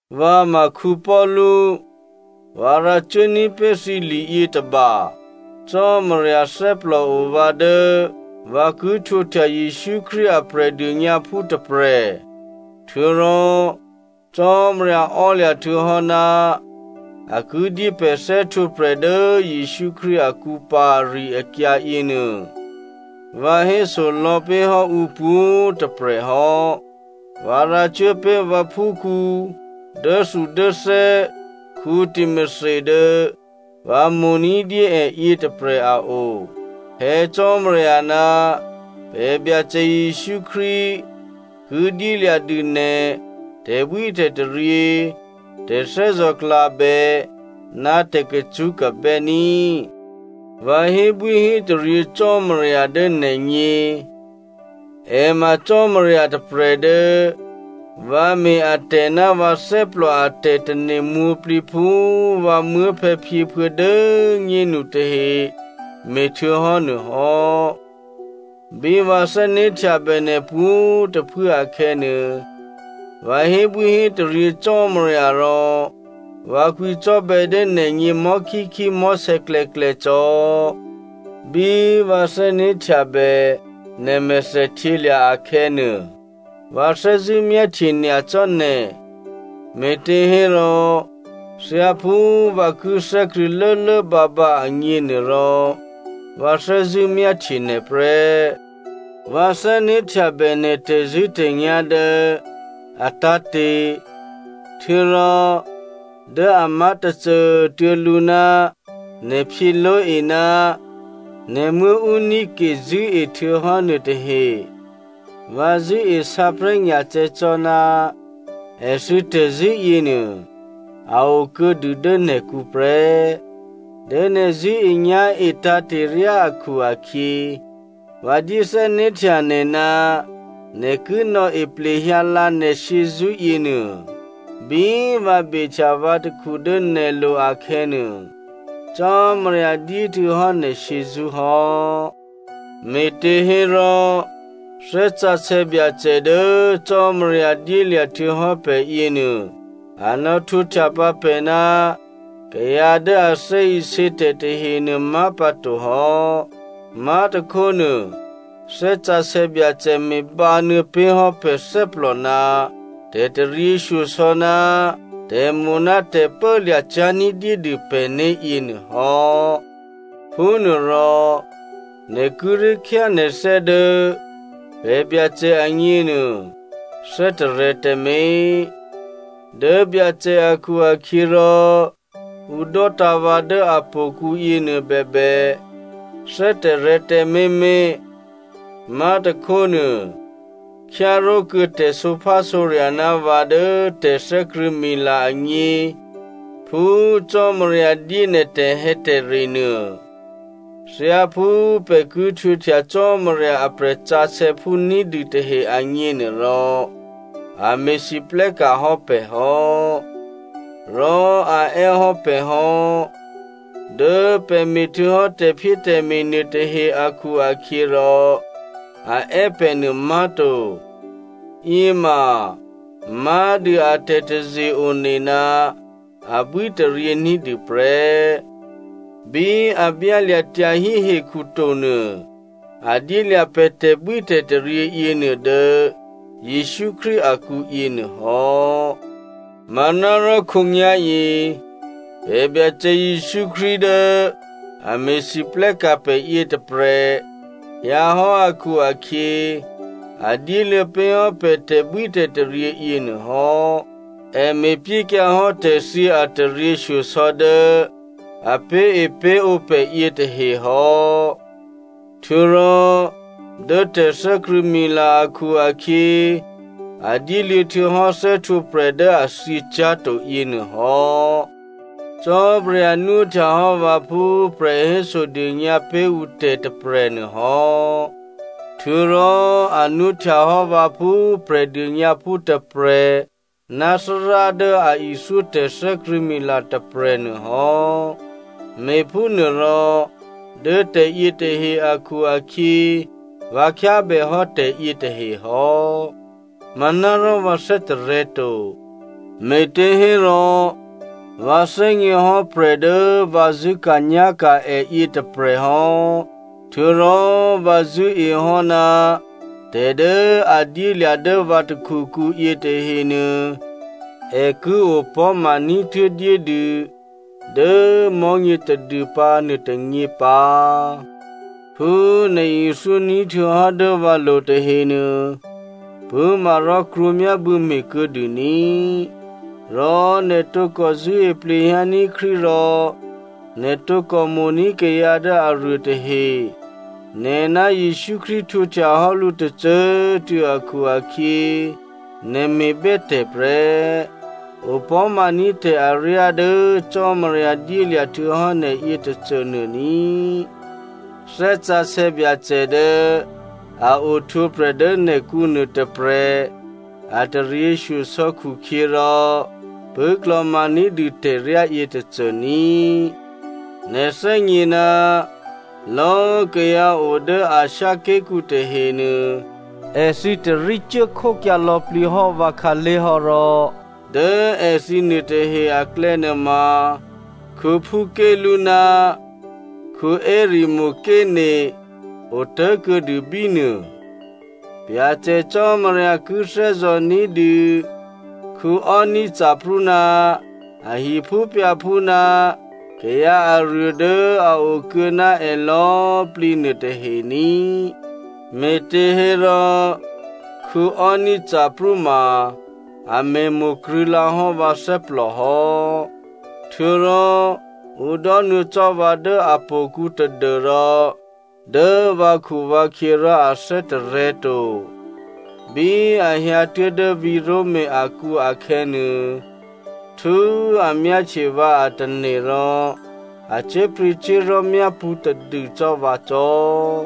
Vǎ ma Paulu. Vǎ rǎcuố ní̤pé̤ thǐ liyětôba. Cò́marya thè́plòo vǎ dố vǎ ki htwǒhtya Jesǔ Krístu a Prè̤dônyǎphú tôprè̤, htuô̌rò Cò́marya ò́lya̤ htuô̌hò́ ná a ki dyé pè̤ thè́htwǒprè̤ dố Jesǔ Krístu akǔ pǎ ari-akyǎ yěnuô vǎ héso lò̌pé̤hò́ ǔ pwǒ̤꤮ tôprè̤ hò́. Vǎ rǎcuố pé̤ vǎphúkhǔ dốthudốthè́ Timothy dố vǎ mo̤ ní̤dyé è yětôprè̤ a o. Phè̌ Cò́marya ná pè̤ Byacè Jesǔ Krístu ki dyélya̤dû nè̤ tè̤bwítè̤taryě, tè̤thè́zò̤klabè, ná tè̤kacṳ́kabè́ ní꤮. Vǎ hébwíhétaryě Cò́marya dố nè̤gně. È ma Cò́marya tôprè̤ dố vǎ me̤ atè̤ ná vǎ thè́plò a tè̤tane̤ mwǒ̤plǐ phú vǎ muốphè̌phyěphuô̌ dố꤮ nyénu tahe me̤htuô̌hò́ nuôhò́. Bí vǎ thè́né̤htyabè nè̤ pwǒ̤꤮ tôphuố akhè̌nuô, vǎ hébwíhétaryě Cò́marya rò vǎ kwǐcò́bè̌ dố nè̤gně mò̤́khíkhí mò̤́sè̌klè̌klè̌ cò́. Bí vǎ thè́né̤htyabè nè̤ mèthèhtyělya̤ akhè̌nuô, vǎ thè́zṳ̂́ myáhtye nyacò́ nè̤, me̤těhérò thyáphú vǎ ki thè́krṳ̂̌ lốlốbǎbǎ agněnuôrò, vǎ thè́zṳ̂́ myáhtye nè̤ prè́. Vǎ thè́né̤htyabè nè̤ tè̤zṳ̂́tè̤nyá̤ dố a tǎ̤te̤ htuô̌rò dố a má̤ tôcô꤮ tuô̌ lǔ ná Nè̤phyě Loi ná nè̤muố̤ Eunice zṳ̂́e htuô̌hò́ nuôtahe. Vǎ zṳ̂́e sǎprè̤́nyacè̌ cò́ ná èthǐ tè̤zṳ̂́ yěnuô a okuô̌dû dố nè̤kǔ prè́. Dố nè̤ zṳ̂́enyá̤e tǎ̤te̤ryá akhu-akhyě, vǎ dyé thè́né̤htya nè̤ ná nè̤ ki nò̌e plehyǎlǎ nè̤ shyězṳ́ yěnuô. Bí vǎ behtya vǎ takhu dố nè̤lo̤ akhè̌nuô, Cò́marya dyéhtuô̌hò́ nè̤ shyězṳ́ hò́. Me̤těhérò, Thè́ Sǎsè̌ Byacè dố Cò́marya dyélya̤ htuô̌hò́ pè̤ yěnuô, a nò̌htwǒhtya pǎ pè̤ ná kayǎ dố a thè́isě tè̤ tahenuô má̤pǎtohò́. Má̤tôkhónuô Thè́ Sǎsè̌ Byacè me̤bǎnuô̌ pé̤hò́ pè̤ thè́plò ná tè̤taryěshyosò̌ ná tè̤mo̤ ná tè̤pốlya̤ cyá̤ ní̤dyédû pè̤né̤ yěnuôhò́. Phúnuôrò, nè̤ kíré̤ khyá nè̤thè́ dố pè̤ Byacè agněnuô thè́tarè̤̌ tǎmé̤, dố Byacè akhu-akhyěrò, ǔ dò́tǎ̤ vǎ dố htò̌kǔ yěnuô bèbè, thè́tarè̤̌ tǎmé̤mé̤. Má̤tôkhónuô khyáró̤kuô̌ tè̤sǒphásǒrya̤ ná vǎ dố tè̤thè́krṳ̂̌mila agně phú Cò́marya dyé nè̤ tè̤hè̌tè̤re nuô. Thyáphú pè̤ ki htwǒhtya Cò́marya a prè̤sǎsè̌phú ní̤dû tahe agněnuôrò, a me̤lwóhteka̤ hò́ pè̤ hò́, rò a è́ hò́ pè̤ hò́, dố pè̤ me̤htuô̌hò́ tè̤phyétè̤me̤ nuôtahe akhu-akhyěrò, a è́ pè̤ nuô má̤to. Yěma má̤dû a tè̤taze-one ná abwítaryě ní̤dû prè́. Bí a byálya̤ tyahí hekhu tonuô a dyélya̤ pè̤ tè̤bwítè̤taryě yěnuô dố Jesǔ Krístu akǔ yěnuôhò́. Manárò khǒnyá̤yě pè̤ Byacè Jesǔ Krístu dố a me̤lwóhteka̤ pè̤ yětôprè̤ hyǎhò́ akhu-akhyě, a dyéluô̌ pé̤hò́ pè̤ tè̤bwítè̤taryě yěnuôhò́. È me̤pyékyǎhò́ tè̤thyě a taryěshyosò̌ dố a pé̤epé̤ǒ pè̤ yětahe hò́. Htuô̌rò dố tè̤thè́krṳ̂̌mila akhu-akhyě, a dyéluô̌ htuô̌hò́ thè́htwǒprè̤ dố a thyě cyá̤to yěnuôhò́. Cò́marya nwóhtyahò́ vǎ phú prè̤hésodônyǎ pé̤ ǔ tè̤ tôprè̤ nuôhò́, htuô̌rò a nwóhtyahò́ vǎ phú Prè̤dônyǎphú tôprè̤ ná Thárá dố a ithyó tè̤thè́krṳ̂̌mila tôprè̤ nuôhò́. Me̤phúnuôrò dố tè̤yětahe akhu-akhyě vǎ khyábèhò́ tè̤yě tahe hò́. Manárò vǎ thè́tarè̤̌ to, me̤těhérò, vǎ thè́gněhò́ prè̤ dố vǎ zṳ̂́ka̤nyá̤ka̤ è yětôprè̤ hò́, htuô̌rò vǎ zṳ̂́ehò́ ná tè̤ dố a dyélya̤ dố vǎ takhukǔ yětahenuô, è ki opò̤́ma ní̤tuố̤dyédû dố mò̤́nyě tadûpǎ nuôtônyě pǎ. Phú nè̤ ithyó ní̤htuô̌hò́ dố vǎlo̤ tahenuô, pṳ̂́ma rò krwǒmyábû̌ me̤ kuô̌dû ní꤮. Rò nè̤ tǒkò zṳ̂́e plehyǎní̤ Krístu rò nè̤ tǒkò mo̤ní̤ kayǎ dố aruô tahe. Nè̤ ná Jesǔ Krístu htwǒhtya hò́ lǔ tôcô꤮ tuô̌ akhu-akhyě nè̤ me̤bè́tè̤ prè́. Opò̤́maní̤ tè̤ aryá dố Cò́marya dyélya̤ htuô̌hò́ nè̤ yětôcônuô ní꤮. Thè́ Sǎsè̌ Byacè dố a ohtwǒprè̤ dố nè̤kǔ nuôtôprè̤ a taryěshyosò̌ khukhyěrò pṳ̂́klò̤ma ní̤dû tè̤ryá yětôcô ní꤮. Nè̤ thè́gně ná lò̌꤮ kayǎ o dố Asia ké̤kǔ tahenuô èthǐ tarí cuốkhókyǎ lò̌plǐhò́ vǎ khǎlé̤ hò́ rò dố èthǐ nuôtahe aklè̌nuôma, Phukelu ná Hermogene otố̤kuô̌dû bí nuô. Byacè Cò́marya ki thè́zò̤ ní̤dû Onesiphoro ná a hiphúphyǎphú ná kayǎ aruô dố a okuô̌ ná è lò̌꤮ plǐ nuôtahe ní꤮. Me̤těhérò, Onesiphoro ma a me̤mo̤ krṳ̂̌lǎ hò́ vǎ thè́plò hò́, htuô̌rò ǔ dò́nuô̌ cò́ vǎ dố htò̌kǔ tadû́rò dố vǎkhuvǎkhyě rò a thè́tarè̤̌ to. Bí a hyǎtuố̤ dố vǐ̤ Roma akǔ akhè̌nuô, htú꤮ a myáhtye vǎ a tane̤ rò a cyé̤pryě̤cyé̤li̤ myápṳ̌ tadû cò́ vǎ cò́.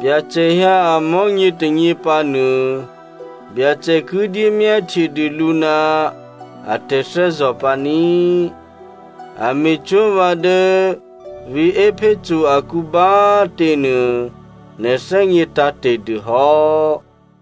Byacè hyǎ amò̤́nyě tônyě pǎnuô Byacè ki dyé myáhtye dû lǔ ná a tè̤thè́zò̤ pǎní꤮. A me̤cwó̤ vǎ dố vǐ̤ Epheso akǔ bá꤮ tě nuô, nè̤ thè́gně tǎ̤te̤ dûhò́.